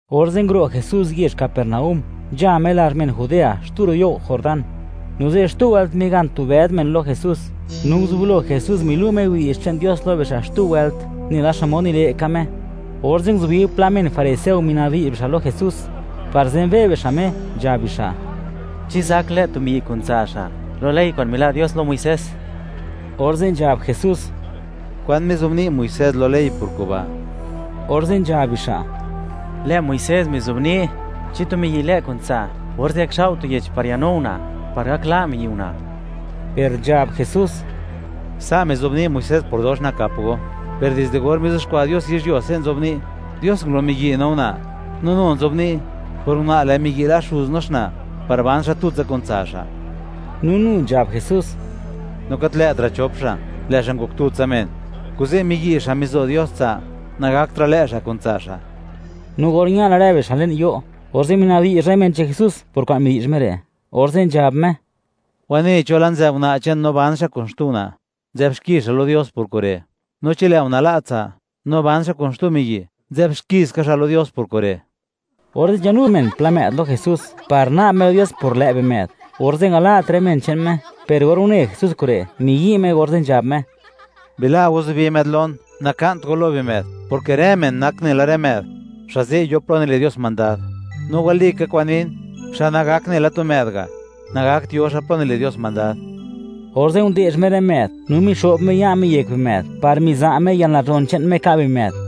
Orze' nguro' Jesús yezh Capernaúm, nzha Me lazh men Judea, xtu ro' you' Jordán. No ze', xtu wëlt, migan tu bëd men lo Jesús, no nguzublo Jesús, milu' Me widi'zh che'n Dios lo bixa' xtu wëlt, nela xmod nile' ka Me. Orze' nguzubi pla men fariseo minabdi'zh bixa' lo Jesús par zenbe' bixa' Me (wi' bixa' xmod nak Me), nzhab bixa': ―¿Chi zak lë' tu miyi' kun tsa' xa', lo ley kwa'n mila' Dios lo Muisés? Orze' nzhab Jesús: ―¿Kwan mizobni' Muisés lo ley por kuba'? Orze' nzhab bixa': ―Lë' Muisés mizobni'; chi tu miyi' lë' kun tsa', orze' gakxao' tu yech par yanu una', par gak la' miyi' una'. Per nzhab Jesús: ―Sa' mizobni' Muisés por dox nakap go, per dizde or mizuxkwa' Dios yizhyuo, se' nzobni': “Dios ngulo miyi' no una'.” No nu nzobni': “Por una', lë' miyi' la' xuz no xna', par ban xa' tutsa kun tsa' xa'.” No nu nzhab Jesús: ―No gat lë'tra' chop xa', lë' xa' ngok tutsa men. Kuze', miyi' xa' mizo Dios tsa', nagaktra' lë' xa' kun tsa' xa'. No or ña la rë bixa' le'n yo', orze' mina'bdi'zh rë men che'n Jesús por kwa'n midi'zh Me re', orze' nzhab Me: ―Wanei cho la' nzë'b una' che'n, no ban xa' kun xtu una', nzë'b xki xa' lo Dios por kure'. No chi lë' una' la' tsa', no ban xa' kun xtu miyi', nzë'b xki ska xa' lo Dios por kure'. Orze' nzhanu men pla më'd lo Jesús, par na'b Me lo Dios por lë' bimë'd; orze' ngala't rë men che'n Me. Per or une Jesús kure', miyi' Me, orze' nzhab Me: ―Bila' go zubi më'd lon, naka'nt go lo bimë'd, porke rë men nak nela rë më'd, xa' ze' yo plo nile' Dios mandad. No walika kwa'n nin, xa' nagak nela tu më'd ga', nagakt yo xa' plo nile' Dios mandad. Orze' nde'zh Me rë më'd, no mixo'b Me ya' Me yek bimë'd, par miza' Me yalnazhon che'n Me ka' bimë'd.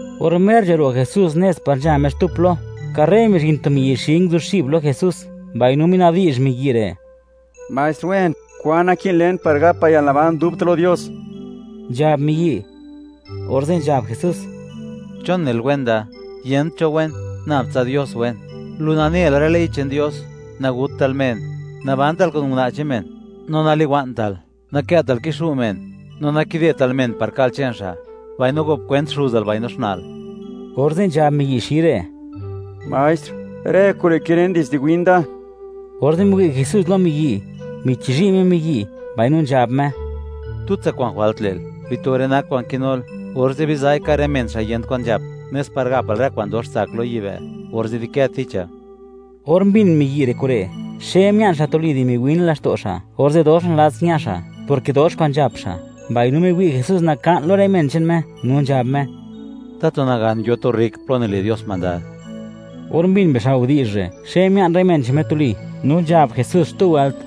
Or mer nzharo' Jesús nez par nzha Me xtu plo, karre mizhin tu miyi' xi, nguzuxib lo Jesús, mbaino minabdi'zh miyi' re': ―Maestr wen, ¿kwan naki'n len par gapa yalnaban dubta' lo Dios? ―nzhab miyi'. Orze' nzhab Jesús: ―¿Chon nel, wen da? Yent cho wen, nab tsa Dios wen. Lu nane la rë ley che'n Dios: “Nagutal men, nabantal kun una' che'n men, no naliwa'ntal, nakë'tal kixu' men, no nakidetal men par ka'l che'n xa'; mbaino gop kwent xuzal mbaino xna'l.” Orze' nzhab miyi' xi re': ―Maestr, rë kure' kilen, dizde win da. Orze' miwi' Jesús lo miyi', michizhi' Me miyi', mbaino nzhab Me: ―Xtutsa kwa'n jwalt le'l: Bito rë nak kwa'n kinul, orze' biza'i, ka' rë men xa' yent kwan nzhap, nes par gapal rë kwa'n dox tsak lo yibë'; orze' di'kë ticha. Or mbin miyi' re' kure', xe mia'n xa' tuli di miwin laxto' xa', orze' dox nalats ña xa', porke dox kwa'n nzhap xa', mbaino miwi' Jesús naka'n lo rë men che'n Me; no nzhab Me: ―¡Tatu nagan yo tu rrik plo nile' Dios mandad! Or mbin bixa' widi'zh re', xe mia'n rë men che'n Me tuli, no nzhab Jesús xtu wëlt: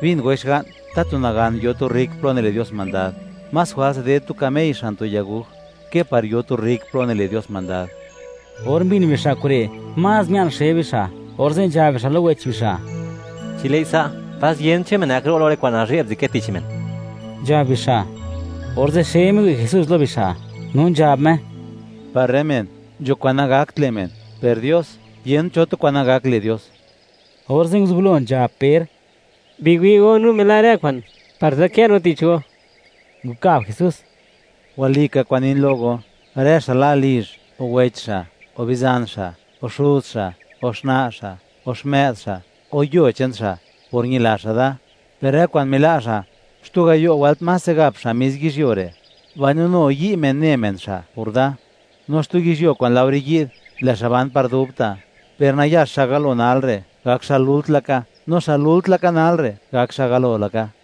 ―Bin goi xga'n, ¡tatu nagan yo tu rrik plo nile' Dios mandad! Más jwals ded tu kamey xan tu yaguj, ke par yo tu rrik plo nile' Dios mandad. Or mbin bixa' kure', más mia'n xe bixa', orze' nzhab bixa' lo wech bixa': ―Chi lë'i sa', ¡pas yent cho men gak ro' lo rë kwa'n nazhe'b kwa'n nzëdkë tich men! ―nzhab bixa'. Orze' xe miwi' Jesús lo bixa', no nzhab Me: ―Par rë men, nzho kwa'n nagakt le' men; per Dios, yent cho tu kwa'n nagak le' Dios. Orze' nguzublo nzhab Per: ―Biwi' go, no mila' rë kwa'n, par nzadkë no tich go. Nkab Jesús: ―Walika kwa'n nin lo go, rë xa' la' lizh, o wech xa', o bizan xa', o xuz xa' o xna' xa', o xmë'd xa', o yuo che'n xa', por ñila xa' da; per rë kwa'n mila' xa', xtu gayo' wëlt máse gap xa' mis yizhyuo re'; mbaino nu yi' men ne men xa' por da; no xtu yizhyuo kwa'n laore yi'd, lë' xa' ban par dubta'. Per nayax xa' galo nal re', gak xa' lult laka; no xa' lult laka nal re', gak xa' galo laka.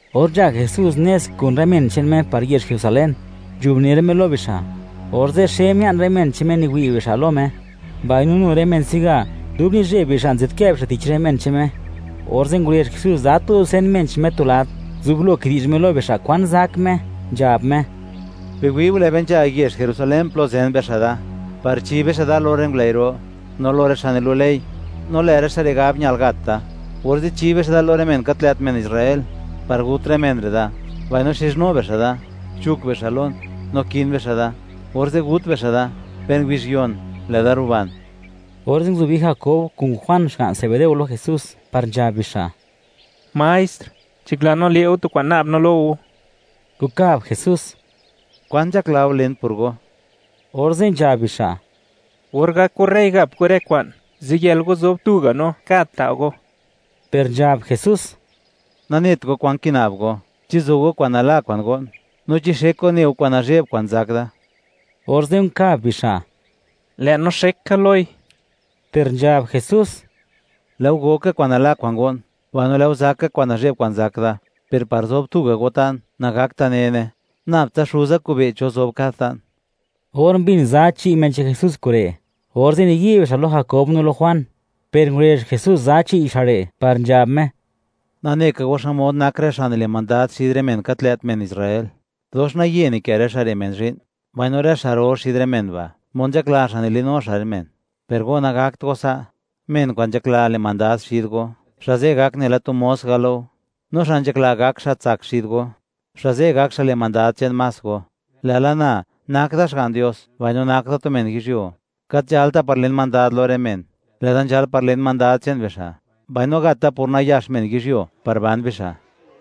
Or nzha Jesús nez kun rë men che'n Me par yezh Jerusalén, nzhubner Me lo bixa'; orze' xe mia'n rë men che'n Me niwi' bixa' lo Me; mbaino nu rë men se'ga, dub nizheb bixa' nzadkë bixa' tich rë men che'n Me. Orze' ngurezh Jesús za tu dusen men che'n Me tu lad, nguzublo kidi'zh Me lo bixa' kwan zak Me, nzhab Me: ―Biwi'u, lë' be nzha yezh Jerusalén plo zen bixa' da, par chi bixa' da lo rë ngulëi' ro, no lo rë xa' nilu' ley; no lë' rë xa' re' gab, ñal gat da; orze' chi bixa' da lo rë men gat lë't men Israel par gut rë men re' da, mbaino xizhnu bixa' da, chuk bixa' lon, no kin bixa' da; orze' gut bixa' da, per ngubizh yon, lë'da ruban. Orze' nguzubi Jakob kun Juan xga'n Zebedeo lo Jesús, par nzhab bixa': ―Maestr, nzhakla no, le' go tu kwa'n na'b no lo go. Nkab Jesús: ―¿Kwan nzhakla go len por go? Orze' nzhab bixa': ―Or gak go rey, gap go rë kwa'n, ziyël go zob tuga' no, kad ta' go. Per nzhab Jesús: ―Nanet go kwan kina'b go. ¿Chi zo go kwa'n nala kwa'n go'n, no chi xek go ne go kwa'n nazhe'b kwa'n zak da? Orze' nkab bixa': ―Lë' no xek ka loi. Per nzhab Jesús: ―Lë' go go ka kwa'n nala kwa'n go'n; mbaino lë' go zakka kwa'n nazhe'b kwa'n zak da, per par zob tuga' go ta'n, nagakta' nene; nab tsa Xuza kobe' (wi') cho zob kad ta'n. Or mbin za chi' men che'n Jesús kure', orze' niyi' bixa' lo Jakob no lo Juan, per ngurezh Jesús za chi' bixa' re' par nzhab Me: ―Nane ka go xmod nak rë xa' nile' mandad xid rë men gat lë't men Israel, dox naye nikë rë xa' re' men zhi'n; mbaino rë xa' ro xid rë men ba', mod nzhakla xa' nilinu xa' rë men. Per go, nagakt go sa'; men kwa'n nzhakla le' mandad xid go, xa' ze' gak nela tu mos ga' lo go, no xa' nzhakla gak xa' tsak xid go, xa' ze' gak xa' le' mandad che'n más go; lë'la na, nak da Xga'n Dios mbaino nak da tu men yizhyuo; gat nzhalta par len mandad lo rë men; lë'da nzhal par len mandad che'n bixa', mbaino gat da por nayax men yizhyuo par ban bixa'.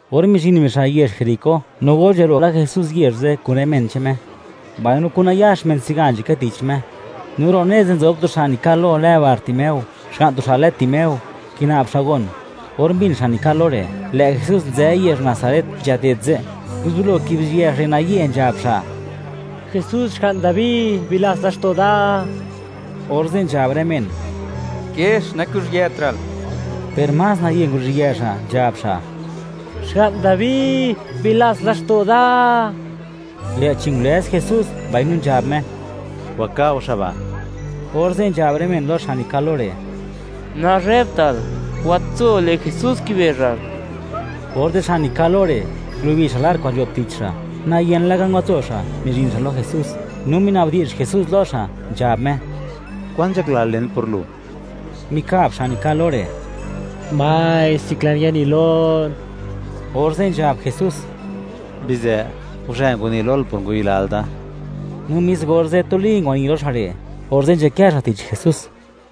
Or mizhin bixa' yezh Jeriko no or nzharo' la Jesús yezh ze' kun rë men che'n Me, mbaino kun nayax men se'ga nzhakë tich Me, no ro' nez ze' nzob tu xa' nikal lo lë Bartimeo, xga'n tu xa' lë Timeo, kina'b xa' gon. Or mbin xa' nikal lo re', lë' Jesús nzë yezh Nazaret nzhaded ze', nguzublo kibizhië xa' re', naye nzhab xa': ―¡Jesús, Xga'n Dabi, bilats laxto' da! Orze' nzhab rë men: “¡Kiex, nakuzhiëtra'l!”, per más nayë nguruzhië xa', nzhab xa': ―¡Xga'n Dabi, bilats laxto' da! Lë'chi ngulëz Jesús, mbaino nzhab Me: ―Waka' go xa' ba'. Orze' nzhab rë men lo xa' nikal lo re': ―¡Nazhebtal, watso; lë' Jesús kibezhal! Orze' xa' nikal lo re', ngulubi xa' lar kwa'n nzho'b tich xa', nayen laka ngwatso xa', mizhin xa' lo Jesús, no minabdi'zh Jesús lo xa', nzhab Me: ―¿Kwan nzhaklal len pur lu? Mikab xa' nikal lo re': ―Maestr, nzhaklan yani lon. Orze' nzhab Jesús: ―Bizë, guzhë ngwani lol por ngwayilal da. No mis orze', tuli ngwani lo xa' re', orze' nzhakë xa' tich Jesús.